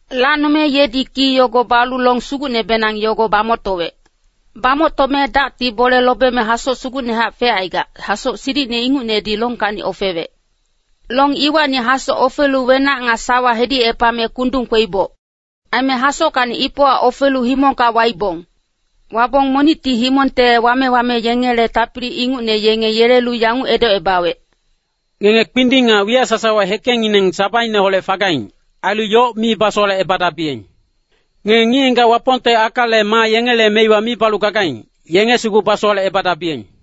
Lacnome yedi ki yogo balu long sugucnebenang yogo bamoctowec. Bamoctome dacti bole lobeme hasoc sugucnehac fecaigac, hasoc silicine ingucnedi longkacni ofewec. Long iwacni hasoc ofelu wenac nga sawa hedicepame kundung kweiboc. Aime hasockacni ipowa ofelu himongka waibong. Wabong monicti himongte wame-wame yengele tapili ingucne yenge yelelu yanguc edocebawec, “Ngenge kpinding nga wiyac sasawa hekengngineng sabaineholec fagaing, ailu yoc mi basowalecebadabiyeng. Ngenge ngic-ngigac Wapongte akale maa yengele meiwa mi balu gagaing, yenge sugu basowalecebadabiyeng.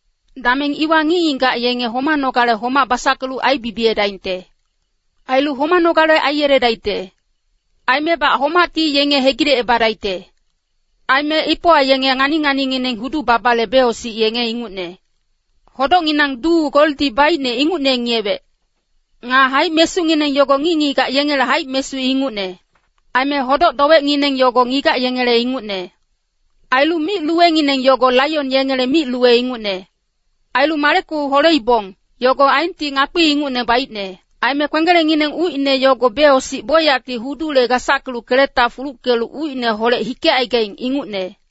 Dameng iwa ngic-ngigac yenge homanogale homac basackelu aibibiyedaingte. Ailu homanogale aiyeledaicte. Aimebac homacti yenge hegilecebadaicte. Aime ipowa yenge ngani-nganingineng hudu-babale becosic yenge ingucne. Hodocnginang duu goldi baicne ingucne ngiyewec. Nga haic-mesungineng yogo ngic-ngigac yengele haic-mesu ingucne. Aime hodoc-dowecngineng yogo ngigac yengele ingucne. Ailu mic-luwengineng yogo laion yengele mic-luwe ingucne. Ailu maleku holeibong, yogo aenti ngakpi ingucne baicne. Aime kwenggelengngineng ucine yogo becosic bocyacti hudule gasackelu keleta fuluckelu ucineholec hikecaigaing ingucne.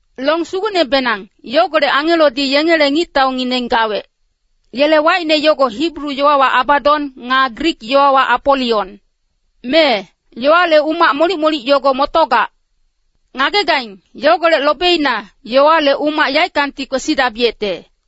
Long sugucnebenang, yogolec angelodi yengele ngictaungineng gawec. Yele wacine yogo Hibru yowawa Abadon, nga Grik yowawa Apolion. Mee, yowale umac molic-molic yogo motogac. Ngagegaing, yogolec lobeina, yowale umac yaeckangti kwesidabiyecte.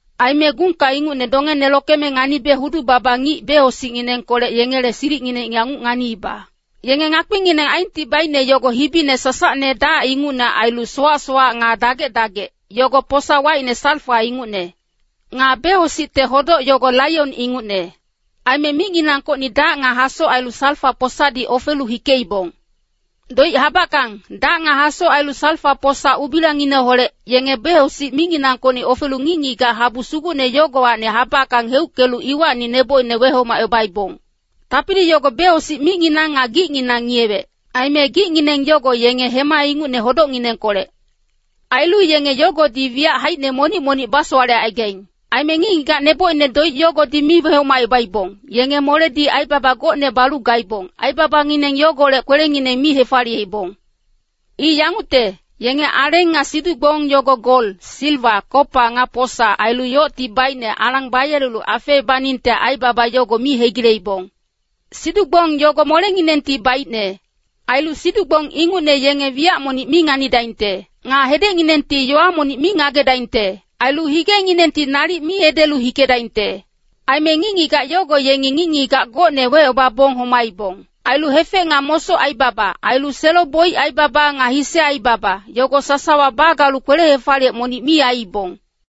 Aime gungka ingucne dongene lokeme nganibe hudu-baba ngic becosicnginengkolec yengele silicngineng yanguc nganiiba. Yenge ngakpingineng aenti baicne yogo hibine sasacne dac ingucne ailu sowac-sowac nga dagec-dagec, yogo posa wacine salfa ingucne. Nga becosicte hodoc yogo laion ingucne. Aime micnginangkocni dac nga hasoc ailu salfa-posadi ofelu hikeibong. Doic habackang, dac nga hasoc ailu salfa-posa ubilangineholec, yenge becosic micnginangkocni ofelu ngic-ngigac habu sugucne yogowacni habackang heuckelu iwacni nebocine wehomacebaibong. Tapili yogo becosic micnginang nga gicnginang ngiyewec. Aime gicngineng yogo yenge hema ingucne hodocnginengkolec. Ailu yenge yogodi wiyac haicine monic-monic basowalecaigaing. Aime ngic-ngigac nebocine doic yogodi mi wehomacebaibong, yenge moledi aibaba gocne balu gaibong, aibabangineng yogolec kwelengineng mi hefaliyeibong. I yangucte, yenge aleng nga siduc-gbong yogo gol, siliwa, kopa, nga posa, ailu yocti baicne alang bayelelu afeebaningte aibaba yogo mi hegileibong. Siduc-gbong yogo molenginengti baicne. Ailu siduc-gbong ingucne yenge wiyac monic mi nganidaingte. Nga hedecnginengti yowa monic mi ngagedaingte. Ailu higenginengti nalic mi edelu hikedaingte. Aime ngic-ngigac yogo yengi ngic-ngigac gocne wecebabong homaibong. Ailu hefec nga mosoc aibaba, ailu selo-boic aibaba nga hise aibaba, yogo sasawa bagalu kwele-hefaliyec monic mi aiibong.